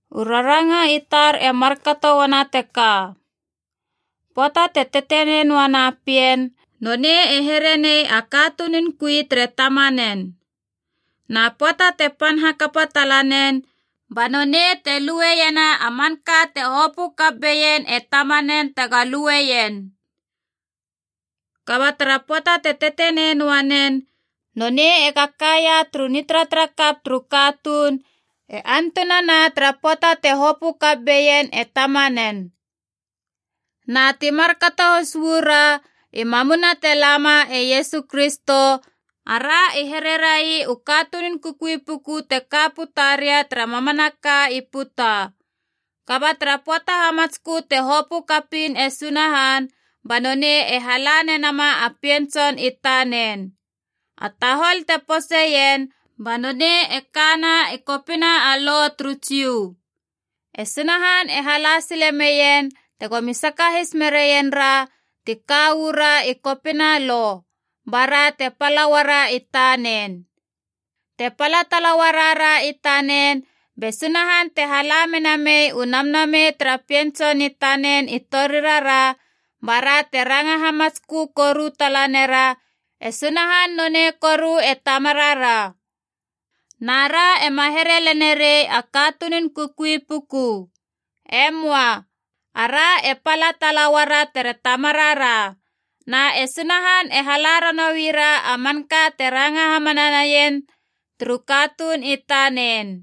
U raranga i tar e markato uana teka. Pöata te tetenei noana pien nonei e herenei a katunun kui tere tamanen. Na pöata te pan hakapa talanen ba nonei te lueiena a manka te hopö kap beien e tamanen tega lueien. Kaba tara pöata te tetenei noa nen nonei ega kaia tara nitaratara kap turu katuun e antunana tara pöata te hopö kap beien e tamanen. Na ti markato has uu ra i mamuna te lama e Iesu Kristo, ara i here rai u katunun kukui puku te ka puta ria tara mamanaka i puta. Kaba tara pöata hamatskö te hopö kapiin e Sunahan, ba nonei e hala nenama a Pien Tson i tanen. A tahol te poseien, ba nonei e kana i kopina a Lo turu Jiu. E Sunahan e hala sile meien tegomi sakahis meraien ra ti ka uu ra i kopina Lo, bara te pala uara i tanen. Te pala tala uarara i tanen, be Sunahan te hala mena mei u Namnamei tara Pien Tson i tanen i torirara bara te ranga hamatskö koru tala nera, e Sunahan nonei koru e Tamarara. Na ra ema here lenerei a katunun kukui puku. E möa. Ara e pala tala uara tere Tamarara. Na e Sunahan e hala ranoui ra a manka te ranga hamana naien turu katuun i tanen.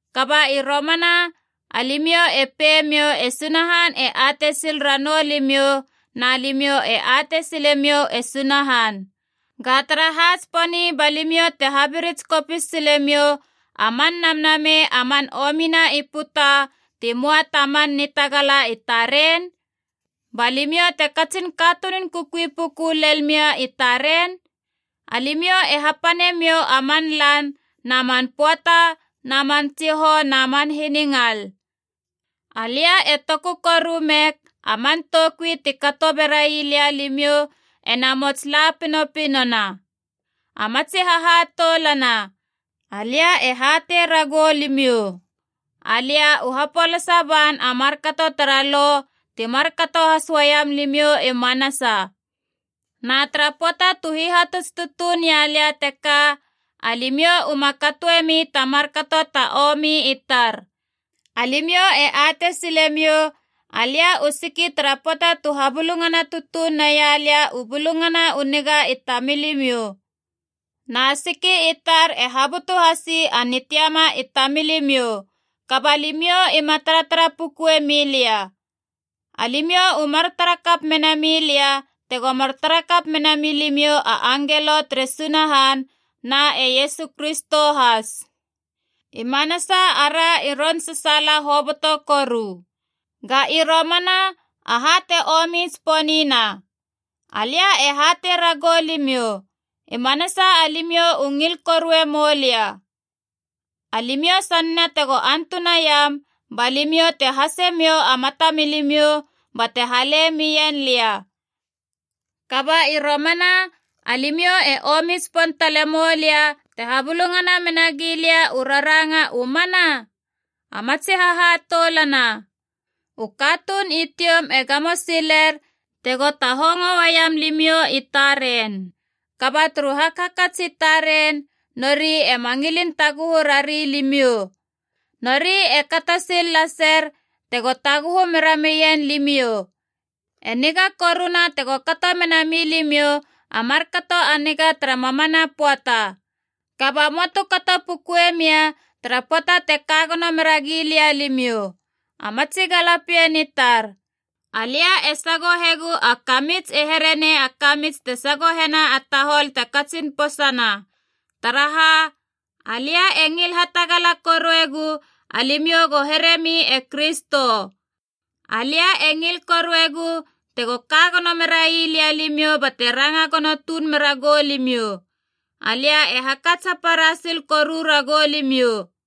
Kaba i romana alimiou e pei miou e Sunahan e atei sil ranou limiou na limiou e atei silemiou e Sunahan. Ga taraha tsiponi ba limiou te habirits kopis silemiou a man namnamei a man omina i puta ti möa ta man nitagala i taren? Ba limiou te katsin katunun kukui puku lel mia i taren? Alimiou e hapane miou a man lan na man pöata na man tsihou na man hiningal. Alia e toku koru meg a man toukui ti kato berai lia limiou ena mots la pinopinona. A matsi hahatoulana, alia e hatei ragou limiou, alia u hapolasa ban a markato tara Lo, ti markato has uaiam limiou i manasa. Na tara pöata tu hihatuts tutuun ia lia teka, alimiou uma katoemi ta markato ta omi i tar. Alimiou e atei silemiou alia u siki tara pöata tu habulungana tutuun naia lia u Bulungana u Niga i tamilimiou. Na siki i tar e habutu hasi a nitiama i tamilimiou, kaba limiou ima taratara pukue milia. Alimiou u mar tarakap mena milia tego mar tarakap mena milimiou a angelo tere Sunahan, na e Iesu Kristo has. I manasa ara i ron sasaala hoboto koru. Ga i romana aha te omi tsiponina? Alia e hatei ragou limiou, i manasa alimiou u ngil korue moulia. Alimiou sanena tego antunaiam, ba limiou te hasea miou a mata milimiou bate hale mien lia. Kaba i romana alimiou e omi tsipon tale moulia te habulungana mena gilia u raranga u mana? A matsi hahatoulana, u katuun i tioum e gamo siler tego tahongo uaiam limiou i taren. Kaba turu hakhakats i taren, nori ema ngilin taguhu rari limiou. Nori e kato sil laser tego taguhu meramien limiou. E niga koruna tego kato mena milimiou a markato a niga tara mamana pöata. Kaba möa tu kato pukue mia tara pöata te kagono mera gilia limiou. A matsi galapien i tar, alia e sagohegu a kamits e herenei a kamits te sagohena a tahol te katsin posana. Taraha, alia e ngil hatagala koruegu alimiou go heremi e Kristo. Alia e ngil koruegu tego ka gono merai limiou bate ranga gono tuun mera goulimiou. Alia e hakats hapara sil koru ragou limiou.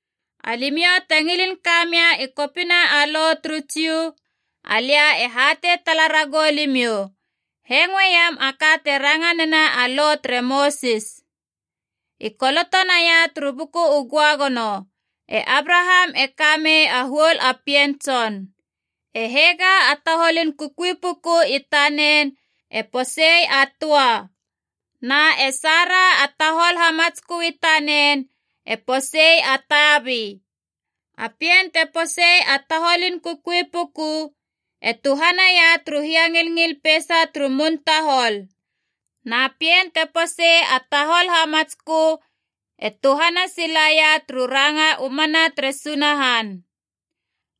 Alimiou te ngilin kamia i kopina a Lo turu Jiu, alia e hatei tala ragou limiou: hengoeiam a ka te ranga nena a Lo tere Mosis. I koloto naia turu Buku u Göagono, e Abraham e kamei a huol a pien tson. E Hega a taholun kukui puku i tanen e posei a töa, na e Sara a tahol hamatskö i tanen e posei a tabi. A pien te posei a taholin kukui puku e tuhanaia turu hiangilngil peisa turu mun tahol. Na pien te posei a tahol hamatskö e tuhana silaia turu ranga u mana tere Sunahan.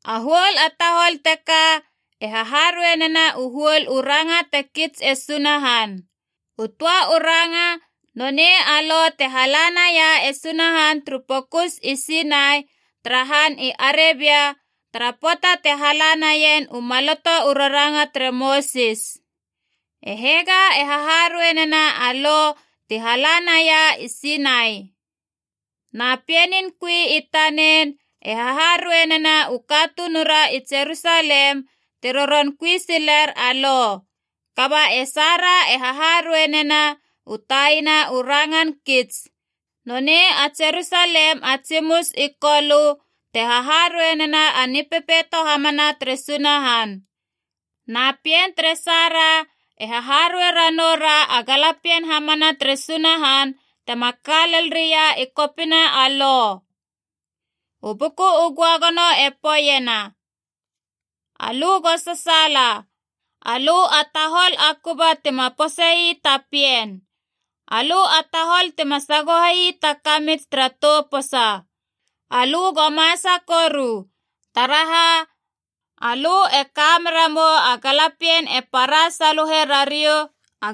A huol a tahol teka e haharuei nena u huol u ranga te kits e Sunahan. U töa u ranga, nonei a Lo te hala naia e Sunahan turu pokus i Sinai tara han i Arebia tara pöata te hala naien u Maloto u Raranga tere Mosis. E Hega e haharuei nena a Lo ti hala naia i Sinai, na pienin kui i tanen e haharuei nena u katunura i Jerusalem te roron kui siler a Lo. Kaba e Sara e haharuei nena u taina u rangan kits, nonei a Jerusalem a tsimus i Kolö te haharuei nena a Nipepeito hamana tere Sunahan. Na pien tere Sara e haharuei ranou ra a galapien hamana tere Sunahan tema ka lel ria i kopina a Lo. U Buku u Göagono e poeiena: “Alö go sasaala, alö a tahol a kuba tima posei ta pien, alö a tahol tima sagohei ta kamits tara tou posa. Alö go masa koru, taraha, alö e ka meramou a galapien e para saluhe rariou,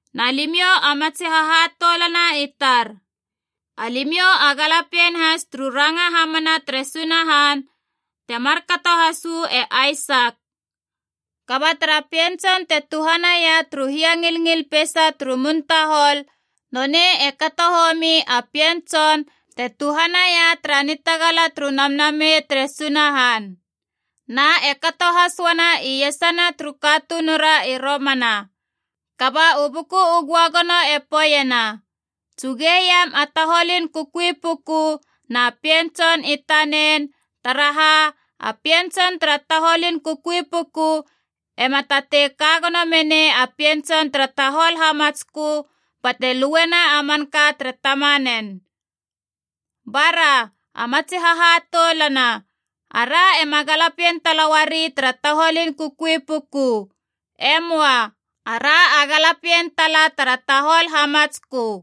Na limiou a matsi hahatoulana i tar, alimiou a galapien has turu ranga hamana tere Sunahan, te markato has uu e Aisak. Kaba tara pien tson te tuhanaia turu hiangilngil peisa turu mun tahol, nonei e kato homi a pien tson te tuhanaia tara nitagala turu Namnamei tere Sunahan. Na e kato has uana i iesana turu katunura i romana. Kaba u Buku u Göagono e poeiena, “Tsugeiam a taholun kukui puku na pien tson i tanen, taraha a pien tson tara taholun kukui puku ema tatei kagono menei a pien tson tara tahol hamatskö bate luena a manka tere tamanen.” Bara, a matsi hahatoulana, ara ema galapien tala uari tara taholun kukui puku. E möa. Ara a galapien tala tara tahol hamatskö.